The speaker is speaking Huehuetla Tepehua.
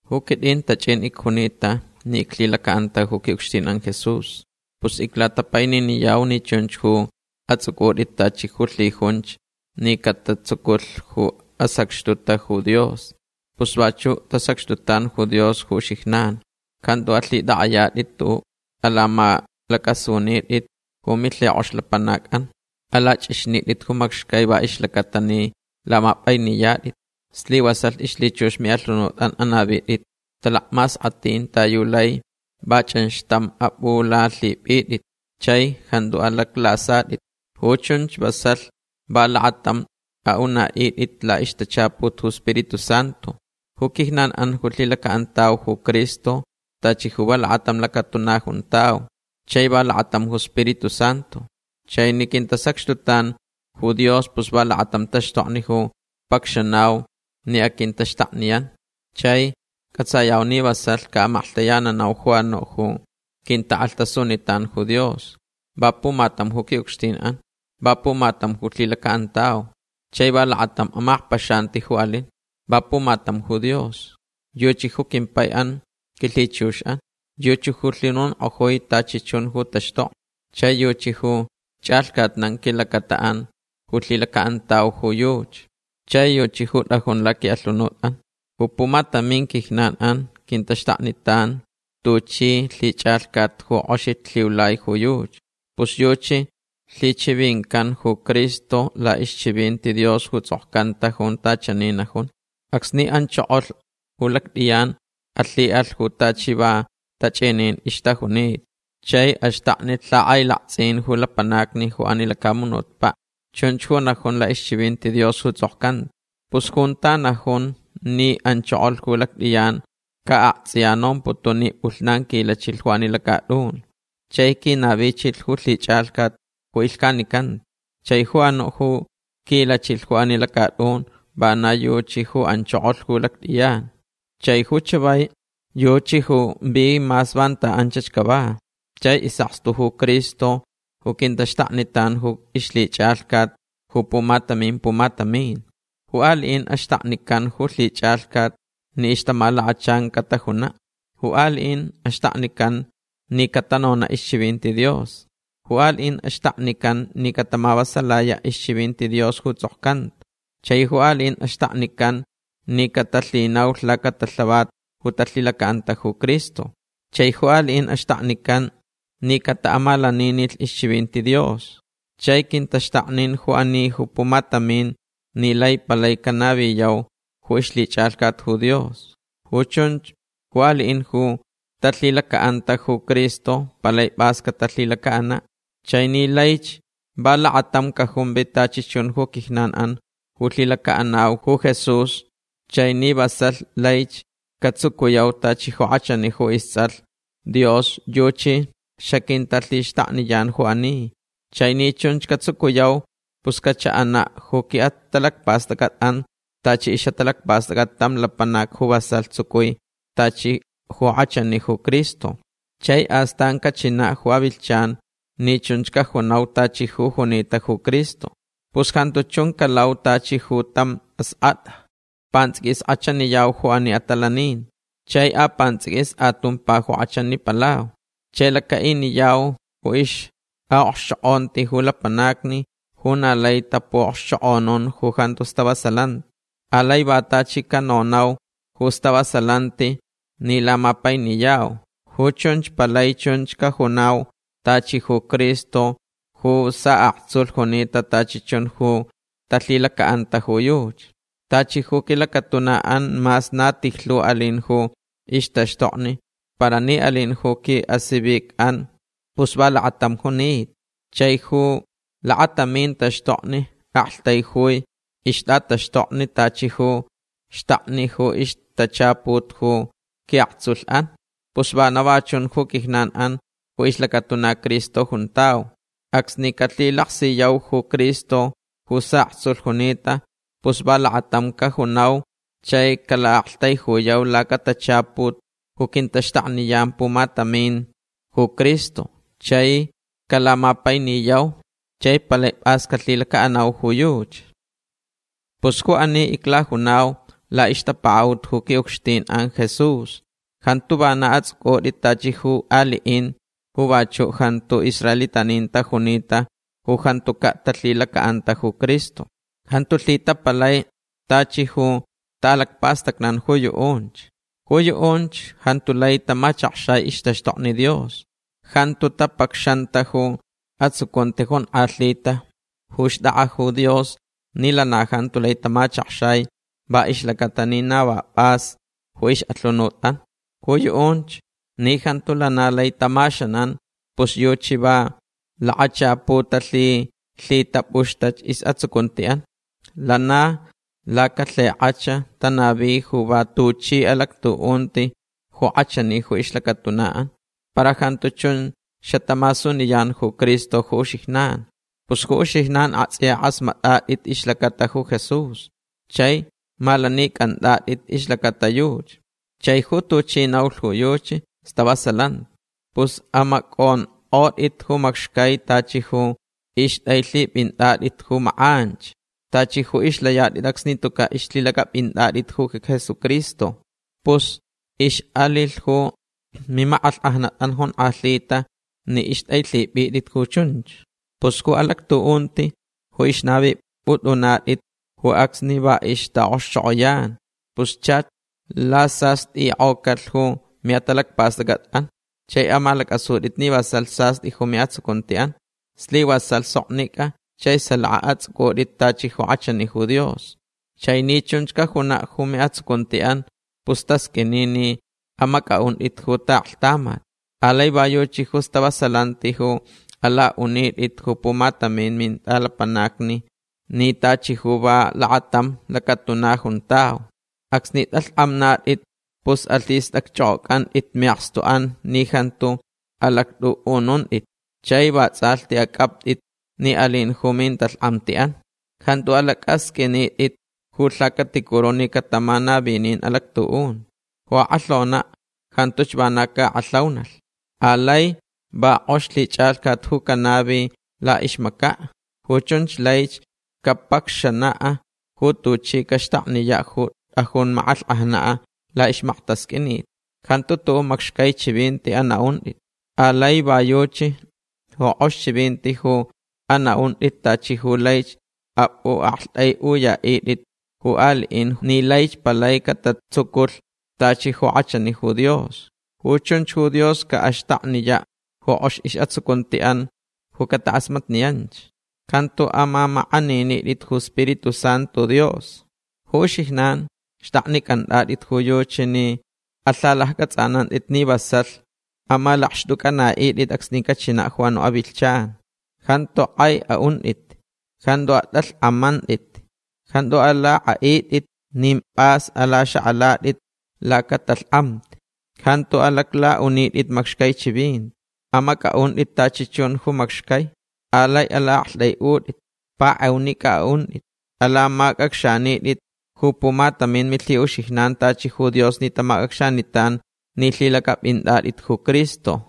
Ju quitʼin tachʼin icjunita ni iclhilacaʼanta ju quiʼucxtinʼan Jesús. Pus iclatapaininiyau ni chunch ju atsʼucʼutʼit tachi ju lhijunch ni catatsuculh ju asacxtuta ju Dios. Pus vachuʼ tasacxtutan ju Dios ju uxijnan. Jantu alhitʼakʼayatʼit tuʼuʼ. Alamalacʼasunitʼit ju milhikʼox lapanacʼan. Alachʼixnitʼit ju macxcai va ixlacaʼatalh ni lamapʼainiyatʼit. Slivasalh ixlhichux miʼalhunutʼan anavitʼit talacmaskʼatʼin ta yu laich va chʼanxtamch apʼulalhipʼitʼit chai jantu alaclasatʼit. Ju chunch vasalh va lakatamch aʼunaʼitʼit laʼixtachaput ju Spiritu Santu. Ju quijnanʼan ju lhilacaʼantauch ju Cristo tachi ju va lakatam lacatuna juntau. Chai va lakatam ju Spiritu Santu. Chai ni quintasacxtutan ju Dios pus va lakatam taxtokni ju pacxanau ni aquintaxtakniyan. Chai cʼatsayau ni vasalh caʼamaklhtayananau ju anuʼ ju quintakʼalhtasunitan ju Dios. Va pumatam ju quiʼucxtinʼan. Va pumatam ju lhilacaʼantauch. Chai va lakatam amakpaxanti ju alin. Va pumatam ju Dios. Yuchi ju quimpaiʼan quilhichuxʼan. Yuchi ju lhinonkʼojui tachi chun ju taxtokni. Chai yuchi ju chʼalhcatnan quilacataʼan ju lhilacaʼantauch ju yuchi. Chai yuchi ju tʼajun laquiʼalhunutʼan. Ju pumatamin quijnanʼan quintaxtaknitan tuchi lhichʼalhcat ju kʼoxich lhiulai ju yuchi. Pus yuchi lhichivincanta ju Cristo laʼixchivinti Dios ju tsʼokcanta junta chani najun: Acsni anchokolh ju lactʼiyan alhiʼalh ju tachi va tachʼinin ixtajunita. Chai axtaknilh lhakʼailaktsʼin ju lapanacni ju ani lacamunutpaʼ. Chunch ju najun laʼixchivinti Dios ju tsʼokcanta. Pus junta najun ni anchokolh ju lactʼiyan ca aktsʼiya nomputun ni pʼulhnan quilachilh ju ani lacatʼun. Chai quinavichilh ju lhichʼalhcat ju ilhcanicanta. Chai ju anuʼ ju quilachilh ju ani lacatʼun vana yuchi ju anchokolh ju lactʼiyan. Chai ju chavai yuchi ju vi mas vanta anchach cava. Chai isʼakstu ju Cristo ju quintaxtaknitan ju ixlhichʼalhcat ju pumatamin pumatamin. Ju aliʼin axtaknican ju lhichʼalhcat ni ixtamalakachan catajunaʼ. Ju aliʼin axtaknican ni catanonaʼ ixchivinti Dios. Ju aliʼin axtaknican ni catamavasalayaʼ ixchivinti Dios ju tsʼokcanta. Chai ju aliʼin axtaknican ni catalhinaulh lacatalhavat ju talhilacaʼanta ju Cristo. Chai ju aliʼin axtaknican ni cataʼamalaninilh ixchivinti Dios. Chai quintaxtaknin ju ani ju pumatamin ni lai palai canaviyau ju ixlhichʼalhcat ju Dios. Ju chunch ju aliʼin ju talhilacaʼanta ju Cristo palai pʼas catalhilacaʼanaʼ. Chai ni laich va lakatam cajumvi tachi chun ju quijnanʼan ju lhilacaʼanauch ju Jesús chai ni vasalh laich catsucuyau tachi ju kʼachani ju istsʼalh Dios yuchi xaquintalhixtakniyan ju ani. Chai ni chunch catsucuyau pus cachaʼanaʼ ju quiʼatalacpastʼacʼatʼan tachi ixʼatalacpastʼacʼat tam lapanac ju vasalh tsucui tachi ju kʼachani ju Cristo. Chai astan cachinaʼ ju avilhchan ni chunch cajunau tachi ju junita ju Cristo. Pus jantu chun calau tachi ju tam askʼatʼa. Pantsʼiquis kʼachaniyau ju ani atalaninti. Chai apantsʼiquis atumpa ju kʼachanipalau. Chai lacaʼiniyau ju ixʼaʼokxchokʼonti ju lapanacni ju na lai tapuʼokxchokʼonun ju jantu stavasalanti. Alai va tachi canonau ju stavasalanti ni lamapainiyau. Ju chunch palai chunch cajunau tachi ju Cristo ju saʼaktsulh junita tachi chun ju talhilacaʼanta ju yuchi. Tachi ju quilacatunaʼan mas na tijlhu alin ju ixtaxtokni para ni alin ju quiʼasivicʼan pus va lakatam junita. Chai ju lakatamin taxtokni aktaijui ixtʼataxtokni tachi ju xtakni ju ixtachaput ju quiʼaktsulhʼan. Pus vana va chun ju quijnanʼan ju ixlacatuna Cristo juntau. Acsni calhilaksiyau ju Cristo ju saʼaktsulh junita pus va lakatam cajunau chai calaʼaktaijuyau lacatachaput ju quintaxtakniyan pumatamin ju Cristo. Chai calamapainiyau chai palai pʼas calhilacaʼanau ju yuchi. Pus ju ani iclajunau laʼixtapakaʼut ju quiʼucxtinʼan Jesús. Jantu vana atsʼucʼutʼit tachi ju aliʼin ju vachuʼ jantu israelitanin tajunita ju jantucaʼ talhilacaʼanta ju Cristo. Jantu lhitapalai tachi ju taʼalacpastacnan ju yuʼunch. Ju yuʼunch jantu lai tamachakxai ixtaxtokni Dios. Jantu tapacxanta ju atsucunti jonkʼalhita ju xtʼakʼa ju Dios ni lana jantu lai tamachakxai va ixlacaʼatalh ni na va pʼas ju ixʼalhunutʼan. Ju yuʼunch ni jantu lana lai tamaxanan pus yuchi va lakachapu talhilhitapʼuxtach isʼatsucuntiʼan. Lana lacalhikʼach tanavi ju va tuchi alactuʼunti ju kʼachani ju ixlacatunaʼan. Para jantu chun xatamasuniyan ju Cristo ju uxijnan. Pus ju uxijnan aktsʼiya kʼasmatʼatʼit ixlacata ju Jesús. Chai malanicʼantʼatʼit ixlacata yuchi. Chai ju tuchi naulh ju yuchi stavasalanti. Pus amacʼonkʼotʼit ju macxcai tachi ju ixtʼailhipʼintʼatʼit ju makʼanch. Tachi ju ixlayatʼit acsni tucaʼ ixlhilacʼapʼintʼatʼit ju Jesucristo. Pus ixʼalilh ju mimakʼalhkʼajnatʼan jonkʼalhita ni ixtʼailhipʼitʼit ju chunch. Pus ju alactuʼunti ju ixnavipʼutʼunatʼit ju acsni va ixtaʼokxchokʼoyan. Pus chach lasastʼikʼocalh ju miʼatalacpastʼacʼatʼan. Chai amalacʼasutʼit ni vasalh sastʼi ju miʼatsucuntiʼan. Slivasalh soknicʼa chai salaka atsʼucʼutʼit tachi ju kʼachani ju Dios. Chai ni chunch cajunaʼ ju miʼatsucuntiʼan pus tasqʼuini ni amacʼaʼuntʼit ju taʼaklhtamat. Alai va yuchi ju stavasalanti ju alaʼunitʼitch ju pumatamin mintʼalapanacni ni tachi ju va lakatam lacatuna juntau. Acsni tʼalhkʼamnatʼit pus alhistʼacchʼokʼocʼantʼit miʼakstuʼan ni jantu alactʼuʼununtʼit. Chai vatsʼalhti acʼaptʼit ni alin ju mintalhkʼamtiʼan. Jantu alacʼasqʼuinitʼit ju lhacaticuru ni catamanavinin alactuʼunti. Ju akʼalhonaʼ jantuch vana caʼakʼalhaunalh. Alai va kʼox lhichʼalhcat ju canavilh laʼixmacaʼ. Ju chunch laich capacxanaʼ ju tuchi caxtakniyaʼ ju tʼajun makʼalhkʼajnaʼ laʼixmaktasqʼuinit. Jantu tuʼuʼ macxcai chivinti anaʼuntʼit. Alai va yuchi ju kʼox chivinti ju anaʼuntʼit tachi ju laich apʼuʼaktʼaiʼuyaʼitʼit ju aliʼin ni laich palai catatsuculh tachi ju kʼachani ju Dios. Ju chunch ju Dios caʼaxtakniyaʼ ju kʼox isʼatsucuntiʼan ju catakʼasmatniyanch. Jantu amamakʼaninitʼit ju iSpiritu Santu Dios. Ju uxijnan xtʼaknicʼantʼatʼit ju yuchi ni alhacʼatsʼanantʼit ni vasalh amalakxtʼucʼanaʼitʼit acsni cachinaʼ ju anuʼ avilhchan. Jantu kʼai aʼuntʼit. Jantu atʼalhkʼamantʼit. Jantu alakʼaʼitʼit nin pʼas alaxakʼalatʼit lacatalhkʼamti. Jantu alaclaʼunitʼit macxcai chivinti. Amacʼaʼuntʼit tachi chun ju macxcai. Alai alaʼaktʼaiʼutʼitch. Pakʼeunicʼa aʼuntʼit. Alamacʼacxanitʼit ju pumatamin milhiʼuxijnan tachi ju Dios ni tamacʼacxanitan ni lhilacʼapʼintʼatʼit ju Cristo.